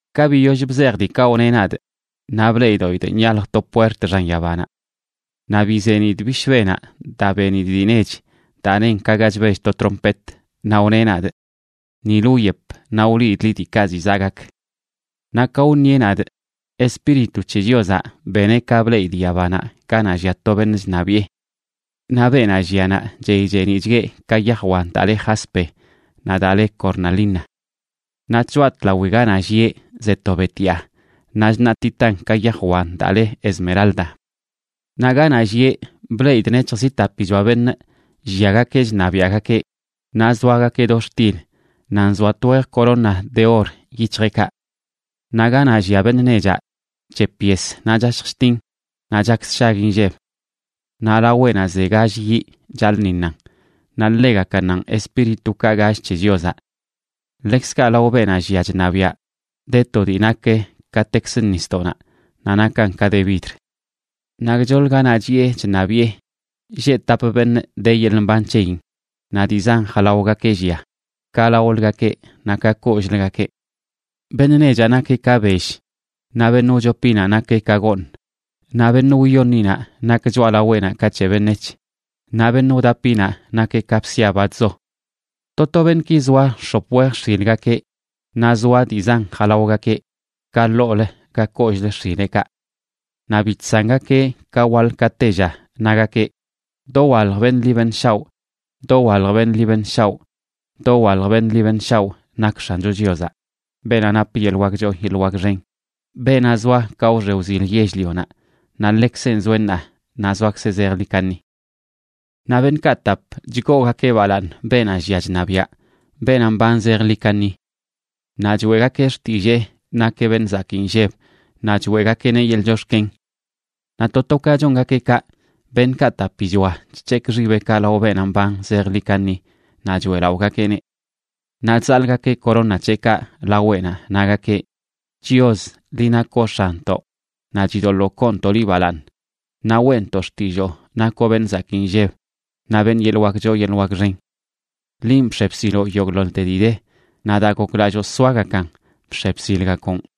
Ka biyoll bzejꞌ diikaꞌ wneꞌ nadꞌ, naꞌ bleꞌdoꞌidꞌ nyalj to puert xan yabanaꞌ. Naꞌ bizenidꞌ bishbenaꞌ daa benidꞌ dii nech daa nen ka ga chbell to trompet, naꞌ wneꞌ nadꞌ: ―Nilə wyep, naꞌ wliidꞌ liꞌ diikaꞌ ziꞌ zaꞌ gak. Naꞌ ka wṉieꞌ nadꞌ, Espíritu c̱he Chiozaꞌ beneꞌ ka bleꞌidꞌ yabanaꞌ ganaꞌ llia to beṉꞌ chṉabiꞌe. Naꞌ beenaꞌ llia naꞌ, chey cheeniꞌchgueꞌ ka yaj wan daa le jaspe naꞌ daa le cornalina. Naꞌ tchoꞌa tlawi ganaꞌ llieꞌ ze to betyaa naꞌ chṉaꞌtitan ka yaj wan daa le esmeralda. Naꞌ ganaꞌ llieꞌ, bleꞌidꞌ nec̱hj zi tapichoa beṉꞌ lliagakeꞌ chṉabiaꞌgakeꞌ, naꞌ zoagakeꞌ do xtil naꞌ nzoa twej corona de or yic̱hjeꞌkaꞌ. Naꞌ ganaꞌ llia beṉꞌ nechaꞌ chep yes, naꞌ chashj chtin, naꞌ chak sshag inlleb. Naꞌ laweꞌnaꞌ ze gall yiꞌ chaḻꞌṉiṉan naꞌ ḻegakannanꞌ espíritukaꞌ gall c̱he Chiozaꞌ. Ḻekzkaꞌ lao beenaꞌ llia chṉabiaꞌ de to dii nak katekzə nisdoꞌnaꞌ naꞌ nakan ka de vidr. Naꞌ gchoḻ ganaꞌ chiꞌe chṉabiꞌe lleꞌ tap beṉꞌ de yeḻꞌ mban c̱heyin, naꞌ dii zan jalaogakeꞌ llia, ka laoləgakeꞌ naꞌ ka kollꞌləgakeꞌ. Beṉꞌ nechaꞌ nakeꞌ ka bell, naꞌ beṉꞌ wchopinaꞌ nakeꞌ ka gooṉ, naꞌ beṉꞌ wyoṉinaꞌ nak choꞌalaweꞌnaꞌ ka c̱he beṉec̱h, naꞌ beṉꞌ wdapinaꞌ nakeꞌ ka bsia, ba chzo. To to beṉꞌki zoa x̱op wej x̱ilgakeꞌ, naꞌ zoa dii zan jalaogakeꞌ ka ḻoolə naꞌ ka kollꞌlə x̱ileꞌkaꞌ. Naꞌ bi chsangakeꞌ ka waḻ ka tella nagakeꞌ: Dowalj beṉꞌ ḻi beṉꞌ shaoꞌ, dowalj beṉꞌ ḻi beṉꞌ shaoꞌ, dowalj beṉꞌ ḻi beṉꞌ shaoꞌ, nak X̱ancho Chiozaꞌ, beenaꞌ nap yeḻꞌ wak choo yeḻꞌ wak xen, beenaꞌ zoa ka wxe wzil yell-lionaꞌ, naꞌ ḻekzenꞌ zoeꞌ ṉaa, naꞌ zoakzeꞌ zejḻi kaṉi. Naꞌ beṉꞌkaꞌ tap chgoogakeꞌ balaaṉ beenaꞌ llia chṉabiaꞌ, beenaꞌ mban zejḻi kaṉi. Naꞌ choeꞌgakeꞌ xtillee nakeꞌ beṉꞌ zakii nlleb naꞌ choeꞌgakeꞌneꞌ yeḻꞌ chox̱ken. Naꞌ to to ka chongakeꞌ kaꞌ, beṉꞌkaꞌ tapichoa chc̱hekꞌ xibeꞌkaꞌ lao beenaꞌ mban zejḻi kaṉi naꞌ choeꞌlaꞌogakeꞌneꞌ. Naꞌ chzaḻꞌgakeꞌ corona c̱heꞌkaꞌ laweꞌnaꞌ, nagakeꞌ: Chios, liꞌ nakoꞌ X̱anntoꞌ, naꞌ chidoḻoo koontoꞌ liꞌ balaaṉ naꞌ weꞌntoꞌ xtilloo nakoꞌ beṉꞌ zakii nlleb, naꞌ beṉꞌ yeḻꞌ wak choo yeḻꞌ wak xen. Linꞌ bx̱e bsiloꞌ yogꞌḻoḻte dii de, naꞌ daa goklalloo soagakan, bx̱e bsilgakoꞌn.